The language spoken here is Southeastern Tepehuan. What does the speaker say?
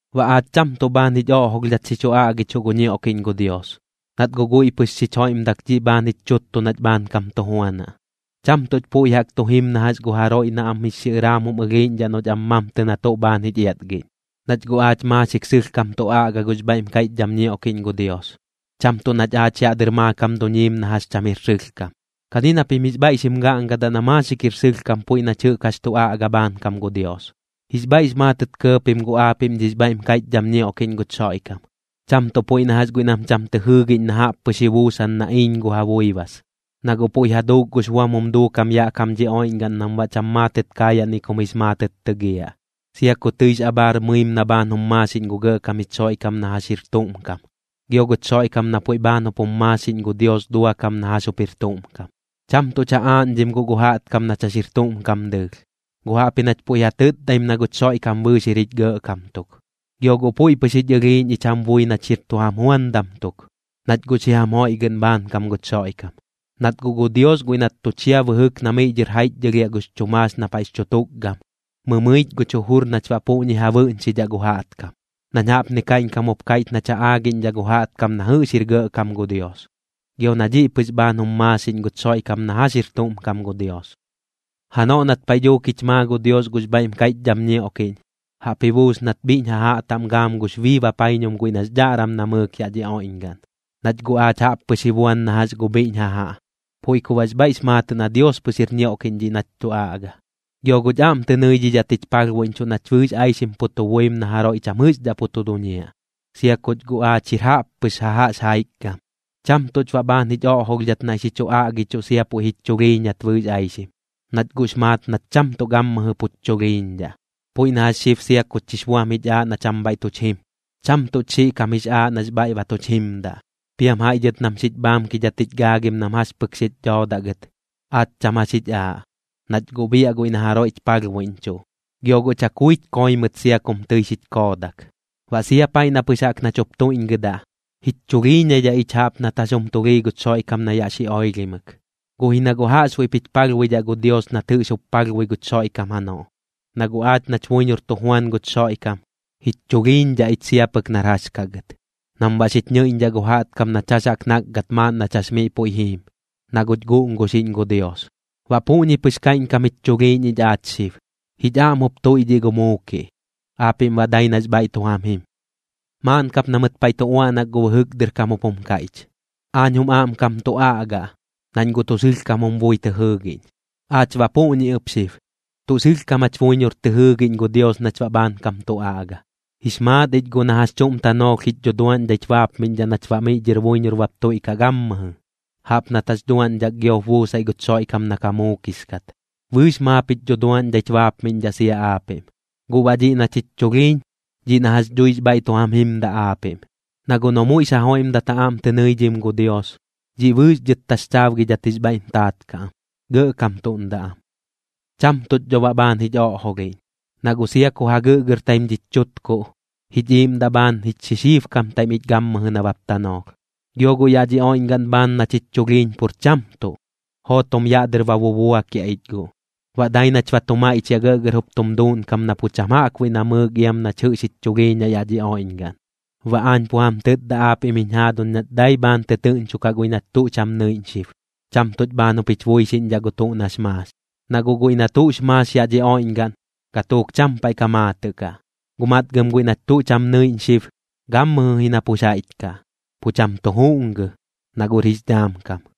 Baꞌ aach cham tuꞌ bhaan jich oꞌjolhdhat xi chu aꞌgichuꞌ gu ñioꞌkiꞌñ gu Dios, nat guꞌ guiꞌ pɨx xich joiꞌmdak dhiꞌ bhaan jich chuttu nach bhaankam tu juanaꞌ. Cham tuꞌch puiꞌ jaꞌk tu jim na jax gu jaroiꞌ na am jix xiꞌɨraam jum ɨlhiiꞌñdhaꞌ noꞌch am mamtɨ na tuꞌ bhaan jich iatgiꞌñ, nach guꞌ aach maaxik sɨlhkam tu aꞌga gux bhaiꞌm kaiꞌchdham ñioꞌkiꞌñ gu Dios, cham tuꞌ nach aach yaꞌ dɨr maakam duñiim na jax cham jir sɨlhkam. Kani na pim jix bhaiꞌ xim gaꞌngadaꞌ na maaxik jir sɨlhkam puiꞌ nach jɨꞌk jax tu aꞌga bhaankam gu Dios. Jix bhaiꞌx maatɨt kɇɇ pim guꞌ aapiꞌm dhix bhaiꞌm kaiꞌchdham ñioꞌkiꞌñ guch Xoiꞌkam, cham tuꞌ puiꞌ na jax guiꞌ nam cham tɨ jɨɨgiꞌñ na jaꞌp pɨx ji buusan na iiñ gu ja buibas. Na guꞌ puiꞌ ja duuk gux buam jum duukam yaꞌ kam dhi oiꞌñgaꞌn nam baꞌ cham maatɨt kaayaꞌ ni kum jix maatɨt tɨgiaꞌ, sia ku tɨix abhaar mɨim na bhaan jum maaxiꞌñ gu Gɇꞌkam jich Xoiꞌkam na jax jir tuꞌm kam, gio guch Xoiꞌkam na puiꞌ bhaan jup jum maaxiꞌñ gu Dios duakam na jax jup jir tuꞌm kam. Cham tuꞌch ja aaꞌñdhim guꞌ gu jaꞌtkam nach jax jir tuꞌm kam dɨɨlh, guꞌ jaꞌpji nach puiꞌ ja tɨtdaim na guch Xoiꞌkam bɨɨx jir jich Gɇꞌkam tuk. Gio guꞌ puiꞌ pɨx jich ɨlhiiꞌñ ich jam bui nach jir tu jam juandam tuk, nach guꞌ xi jam joiꞌgɨꞌn bhaankam guch Xoiꞌkam. Nat guꞌ gu Dios guiꞌ nat tu chia bɨjɨk na miꞌ dhɨr jaiꞌchdhɨlhiaꞌ gux chu maax na paiꞌx chu tukgam, mɨmɨich guch jujur nach baꞌ puꞌñi ja bɨꞌñxidhaꞌ gu jaꞌtkam, nañ jaꞌpni kaiꞌñkam jup kaiꞌch nach ja aagiꞌñdhaꞌ gu jaꞌtkam na jɨꞌx jir gɇꞌkam gu Dios, gio na dhiꞌ pɨx bhaan jum maaxiꞌñ guch Xoiꞌkam na jax jir tuꞌm kam gu Dios. Janoꞌ nat paiꞌ dhuuk jich maa gu Dios gux bhaiꞌm kaiꞌchdham ñioꞌkiꞌñ, jaꞌp ji buus nat bhiꞌñ jajaꞌ taꞌm gaam gux bii bapaiñum guiꞌ nax dhaꞌram namɨɨk yaꞌ dhi oiꞌñgaꞌn. Nach guꞌ aach jaꞌp pɨx ji buan na jax gu bhiꞌñ jajaꞌ, puiꞌ ku baꞌx bhaiꞌx maatɨꞌ na Dios pɨx jir ñioꞌkiꞌñ dhiꞌ nach tu aꞌga, gio guꞌch aꞌm tɨ nɨidhidhat jich palhbuiꞌñchuꞌ nach bɨɨx aixim pu tu buim na jaroiꞌ cham jɨꞌxdhaꞌ pu tu duñiaꞌ, sia kuch guꞌ aach jir jaꞌppɨx jajaꞌx jaikgam. Cham tuꞌch baꞌ bhaan jich oꞌjolhdhat naiꞌ xi chu aꞌgichuꞌ sia puiꞌ jich chulhiiñat bɨɨx aixim, nach guꞌx maat nach cham tuꞌ gammɨjɨ puch chulhiiñdhaꞌ. Puiꞌ na jax xib sia kuch jix buam jich aaꞌ na cham bhaiꞌ tuch jim, cham tuꞌch xiꞌ kam jix aaꞌ nax bhaiꞌ ba tuch jimdaꞌ. Piam jaiꞌ dhɨt nam xich bhaamkidhat jich gaagim nam jax pɨk xich dhoodaꞌ gɨt, aach cham jax jich aaꞌ, nach guꞌ biaꞌ guiꞌ na jaroiꞌch palhbuiꞌñchuꞌ. Gio guꞌ chakuich koi mɨt sia kum tɨi xich koodak. Baꞌ sia paiꞌ na pɨx jaꞌk nach jup tuiꞌñgɨdaꞌ, jich chulhiiñaidhaꞌ ich jaꞌp nat jax jum tulhii guch Xoiꞌkam na yaꞌ xi oilhimɨk, guꞌ ji na guꞌ jaꞌxbuiꞌp jich palhbuidhaꞌ gu Dios nat jɨꞌx jup palhbui guch Xoiꞌkam janoꞌ. Na guꞌ aach nach buiñor tu juan guch Xoiꞌkam, jich chulhiiñdhaꞌ ich sia pɨk nar jax kaꞌ gɨt, nam baꞌ xich ñɨiꞌñdhaꞌ gu jaꞌtkam nach jax jaꞌk nakgat maaꞌn nach jax miꞌ puiꞌ jiim, na guꞌch guꞌnguxiꞌñ gu Dios. Baꞌ puꞌñi pɨx kaiꞌñkam jich chulhiiñ ich aach xib, jich aꞌm jup tuiꞌdhiꞌ gu muukiꞌ, aapiꞌm baꞌ dai nax bhaiꞌ tu jam jim. Maaꞌn kap na mɨt paiꞌ tu uaꞌnak gu bɨjɨk dɨr kam jup jum kaiꞌch: “Aañ jum aꞌmkam tu aꞌga, nañ guꞌ tuꞌ sɨlhkam jum bui tɨ jɨɨgiꞌñ.” Aach baꞌ puꞌñi ɨp xib, tuꞌ sɨlhkam jach buiñor tɨ jɨɨgiꞌñ gu Dios nach baꞌ bhaankam tu aꞌga. Jix maat ich guꞌ na jax chuꞌm tanoolh jich dhuduaꞌñdhaich baapmiꞌñdhaꞌ nach baꞌ miꞌ dhɨr buiñor bap tuiꞌkaꞌ gammɨjɨ, jaꞌp nat jax duaꞌñdhak giop buusaiꞌ guch Xoiꞌkam na ka muukix kat. Bɨɨx maap jich dhuduaꞌñdhaich baapmiꞌñdhaꞌ sia aapiꞌm. Guꞌ baꞌ dhiꞌ nach jich chulhiiñ, dhiꞌ na jax dhuix bhaiꞌ tu jam jimdaꞌ aapiꞌm. Na guꞌ noꞌ muiꞌx ja joiꞌmdat ja aꞌm tɨ nɨidhim gu Dios, dhiꞌ bɨɨx dhɨt taxchaabgidhat jix bhaiꞌm taat kaꞌ am, gɇꞌkamtuꞌndaꞌ am. Cham tuꞌch dho baꞌ bhaan jich oꞌjolhiꞌñ, na guꞌ sia ku ja gɨꞌgɨrtaim dhich chutkuꞌ, jich iiꞌmdaꞌ bhaan jich xixiibkamtaim ich gammɨjɨ nabap tanoolh. Gio guꞌ yaꞌ dhi oiꞌñgaꞌn bhaan nach jich chulhiiñ pur cham tuꞌ, jootom yaꞌ dɨr ba bubuakiaꞌ ich guꞌ. Baꞌ dai nach ba tu maiꞌchiaꞌ gɇꞌgɇr jup tum duuꞌnkam na pu cham jaꞌkbuiꞌ namɨɨk iam nach jɨꞌx jich chulhiiñaꞌ yaꞌ dhi oiꞌñgaꞌn. Baꞌ aañ pu jam tɨtda aapiꞌm jiñ jaaduñ nach dai bhaan tɨtɨɨꞌñchokaꞌ guiꞌ nach tuꞌ cham nɨiꞌñ xib, cham tuꞌch bhaan jup jich buixiꞌñdhaꞌ gu tuꞌ nax maax. Na guꞌ guiꞌ na tuꞌx maax yaꞌ dhi oiꞌñgaꞌn, gatuuk cham paiꞌ ka maatɨꞌ kaꞌ, guꞌ matgɨm guiꞌ nach tuꞌ cham nɨiꞌñ xib, gammɨjɨ ji na pux jaiꞌch kaꞌ, pu cham tu juꞌngɨ, na guꞌr jix dhaam kam.